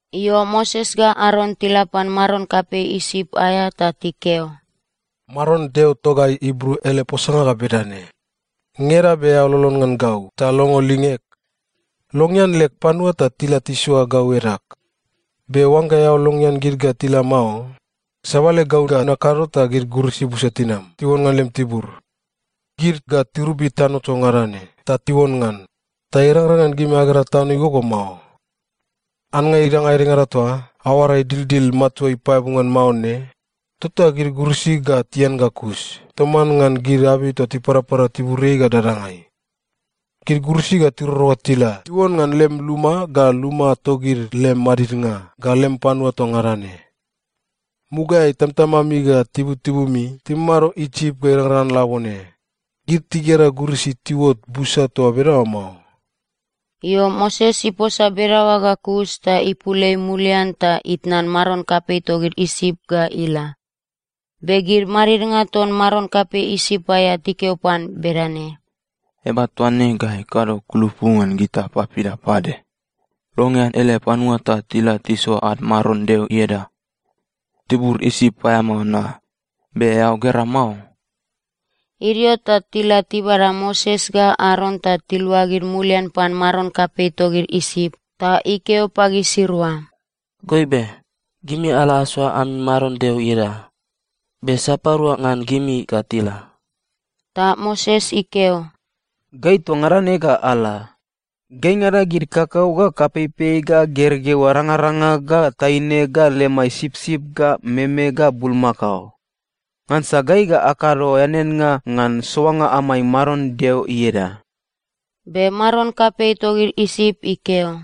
Io, Moses ga Aron tila pan maron kapei Isip aea ta tikeo, “Maron Deo togai Ibru ele posanga ga bedane: ‘Ngeda be eao lolon ngan gau ta longo lingeg? Longean leg panua ta tila tisoa gau edag. Be oangga eao longean gid ga tila mao, sabale gau ga nakado ta gid gurisi busa tinam tiuon ngan lem tibur. Gid ga tirobi tibur toa ngada ne ta tiuon ngan, ta irangrang ngan gimi agera tano igogo mao. Annga idanga edengada toa aoara idildil matua ipaeabu ngan mao ne, tota gid gurisi ga tian ga kus toman ngan gid abei toa tiparapara tiburiai ga dadangai. Gid gurisi ga tiroro ga tila tiuon ngan lem luma ga luma togid lem madidnga ga lem panua toa ngada ne. Mugaeai, tamatamami ga tibutibumi timamado Isip ga irangrang ngan labone, gid tigera gurisi tiuot busa toa bedaoa mao.’” Io, Moses iposa bedaoa ga kus ta ipul ei mulian ta itnan maron kapei togid Isip ga ila. Be gid madidnga ton maron kapei Isip aea tikeo pan bedane, “Eaba toa ne ga ikado kulupu ngan gita papida pade? Longean ele panua ta tila tisoa ad Maron Deo ieda! Tibur Isip paeamao na. Be eao gera mao?” Idio ta tila tibada Moses ga Aron ta tiluagid mulian pan maron kapei togid Isip, ta ikeo pagisirua, “Goibe. Gimi ala asoa ami Maron Deo ieda. Be sapadua ngan gimi ga tila?” Ta Moses ikeo, “Gai toa ngada ne ga ala. Gaingada gid kakau ga kapeipei ga gergeu arangaranga ga taine ga lemai sipsip ga meme ga bulmakao. Ngansa gai ga akado eaneannga ngan soanga amai Maron Deo ieda.” Be maron kapei togid Isip ikeo,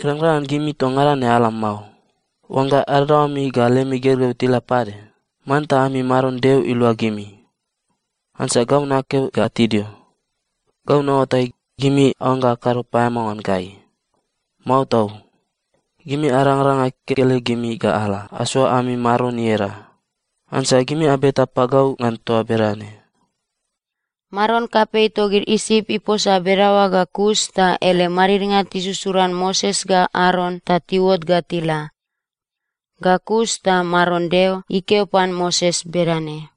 “Irangrang ngan gimi toa ngada ne ala mao. Oangga adadaoami ga lemi gergeu tila pade, manta ami Maron Deo ilua gimi! Ngansa gau nakeo ga tidio. Gau naoatai, gimi aoangga akado paeamao ngan gai. Mao tau! Gimi arangaranga kekelegimi ga ala asoa ami Maron ieda. Ngansa gimi abeta pagau ngan toa bedane.” Maron kapei togid Isip iposa bedaoa ga kus ta ele madidnga tisusuran Moses ga Aron ta tiuot ga tila. Ga kus ta Maron Deo ikeo pan Moses bedane,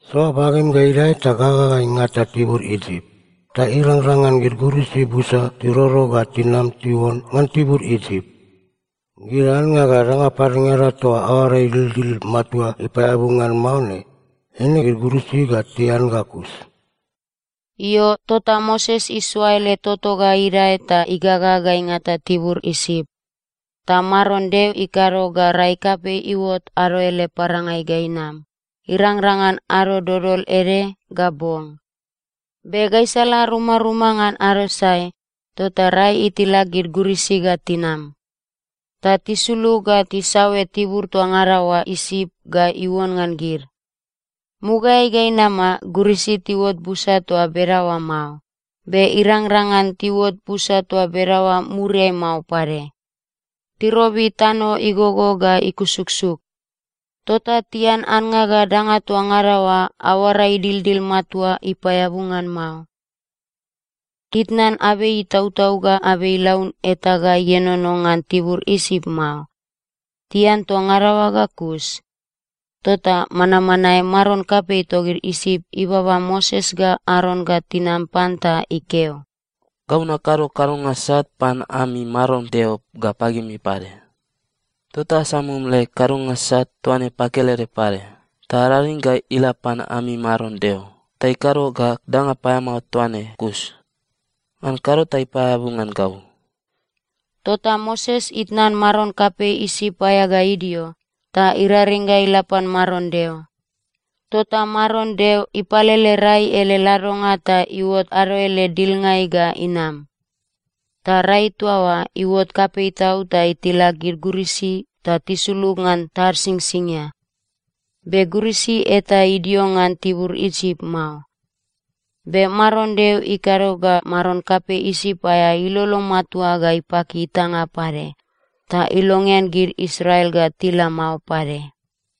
“Soa bagem ga idae ta gaga ga ingata tibur Isip. Ta irangrang ngan gid gurisi busa tiroro ga tinam tiuon ngan tibur Isip. Gid annga ga danga padengada toa aoara idildil matua ipaeabu ngan mao ne, eine gid gurisi ga tian ga kus.” Io, tota Moses isoa ele toto ga idae ta igaga ga ingata tibur Isip, ta Maron Deo ikado ga rai kapei iuot ado ele parangai ga inam, irangrang ngan ado dodol ede ga bong. Be gaisala rumaruma ngan ado sae tota rai itilak gid gurisi ga tinam. Ta tisulug ga tisaoe tibur toa ngada oa Isip ga iuon ngan gid. Mugaeai ga inama, gurisi tiuot busa toa bedaoa mao. Be irangrang ngan tiuot busa toa bedaoa muriai mao pade. Tirobi tano igogo ga ikusuksuk. Tota tian annga ga danga toa ngada oa aoara idildil matua ipaeabu ngan mao. Titnan abei itautau ga abei ilaun eta ga ienono ngan tibur Isip mao. Tian toa ngada oa ga kus. Tota manmanae maron kapei togid Isip ibaba Moses ga Aron ga tinam pan ta ikeo, “Gau nakado kadonga sat pan ami Maron Deo ga pagimi pade. Tota asamum leg kadonga sat toa ne pakelede pade, ta araring ga ila pan ami Maron Deo ta ikado ga danga paeamao toa ne kus. Ngan kado ta ipaeabu ngan gau.” Tota Moses itnan maron kapei Isip aea ga idio, ta iraring ga ila pan Maron Deo. Tota Maron Deo ipalele rai ele ladonga ta iuot ado ele dilngai ga inam. Ta rai toa oa iuot kapei tau ta itilak gid gurisi ta tisulug ngan tad Singsingia. Be gurisi eta idio ngan tibur Isip mao. Be Maron Deo ikado ga maron kapei Isip aea ilolo matua ga ipaki itanga pade. Ta ilongean gid Israel ga tila mao pade.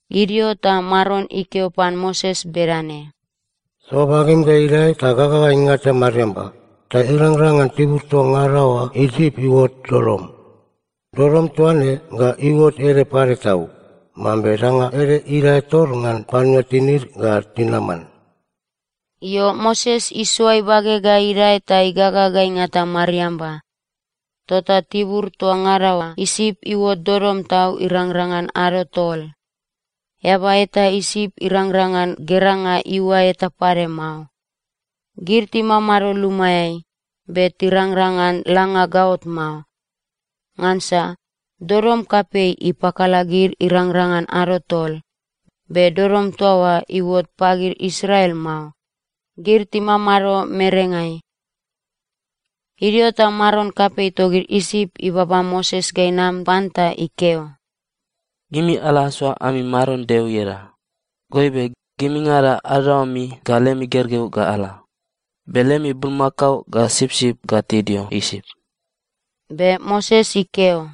Idio ta Maron ikeo pan Moses bedane, “Soa bagem ga idae ta gaga ga ingata mariamba, ta irangrang ngan tibur toa ngada oa Isip iuot dodom. Dodom toa ne ga iuot ede pade tau, mambe danga ede idae tor ngan panua tinid ga tinaman.” Io, Moses isoa ibage ga idae ta igaga ga ingata mariamba, tota tibur toa ngada oa Isip iuot dodom tau irangrang ngan ado tol. Eaba eta Isip irangrang ngan geranga iuae eta pade mao. Gid timamado lumaeai, be tirangrang ngan langa gaot mao, ngansa dodom kapei ipakala gid irangrang ngan ado tol. Be dodom toa oa iuot pagid Israel mao. Gid timamado merengai. Idio ta maron kapei togid Isip ibaba Moses ga inam pan ta ikeo, “Gimi ala asoa ami Maron Deo ieda. Goibe, gimingada adadaoami ga lemi gergeu ga ala. Be lemi bulmakao ga sipsip ga tidio Isip.” Be Moses ikeo,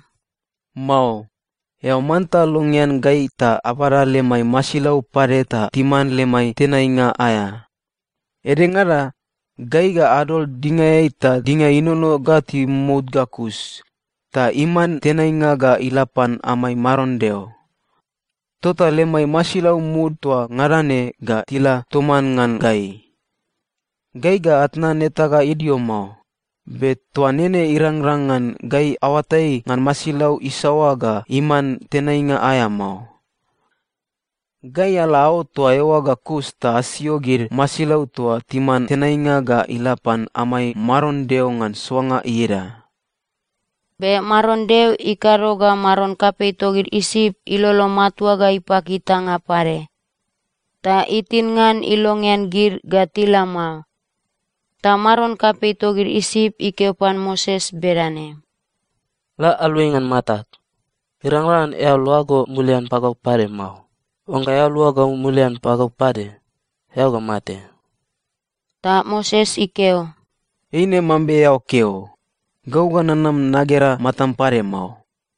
“Mao. Eao manta longean gai ta abada lemai masilau pade ta timan lemai tenainga aea. Edengada, gai ga adol dingaeai ta dinga inono ga timomout ga kus, ta iman tenainga ga ila pan amai Maron Deo. Tota lemai masilau mud toa ngada ne ga tila toman ngan gai. Gai ga atnan eta ga idio mao. Be toa nene irangrang ngan gai aoatai ngan masilau isaoa ga iman tenainga aea mao. Gai ala aot toa eoa ga kus ta asio gid masilau toa timan tenainga ga ila pan amai Maron Deo ngan soanga ieda.” Be Maron Deo ikado ga maron kapei togid Isip ilolo matua ga ipaki itanga pade. Ta itin ngan ilongean gid ga tila mao. Ta maron kapei togid Isip ikeo pan Moses bedane, “La aluai ngan matag! Irangrang ngan eao luago mulian pagau pade mao. Oangga eao luago mulian pagau pade, eao ga mate.” Ta Moses ikeo, “Eine mambe eao keo. Gau ga nanam nagera matam pade mao.”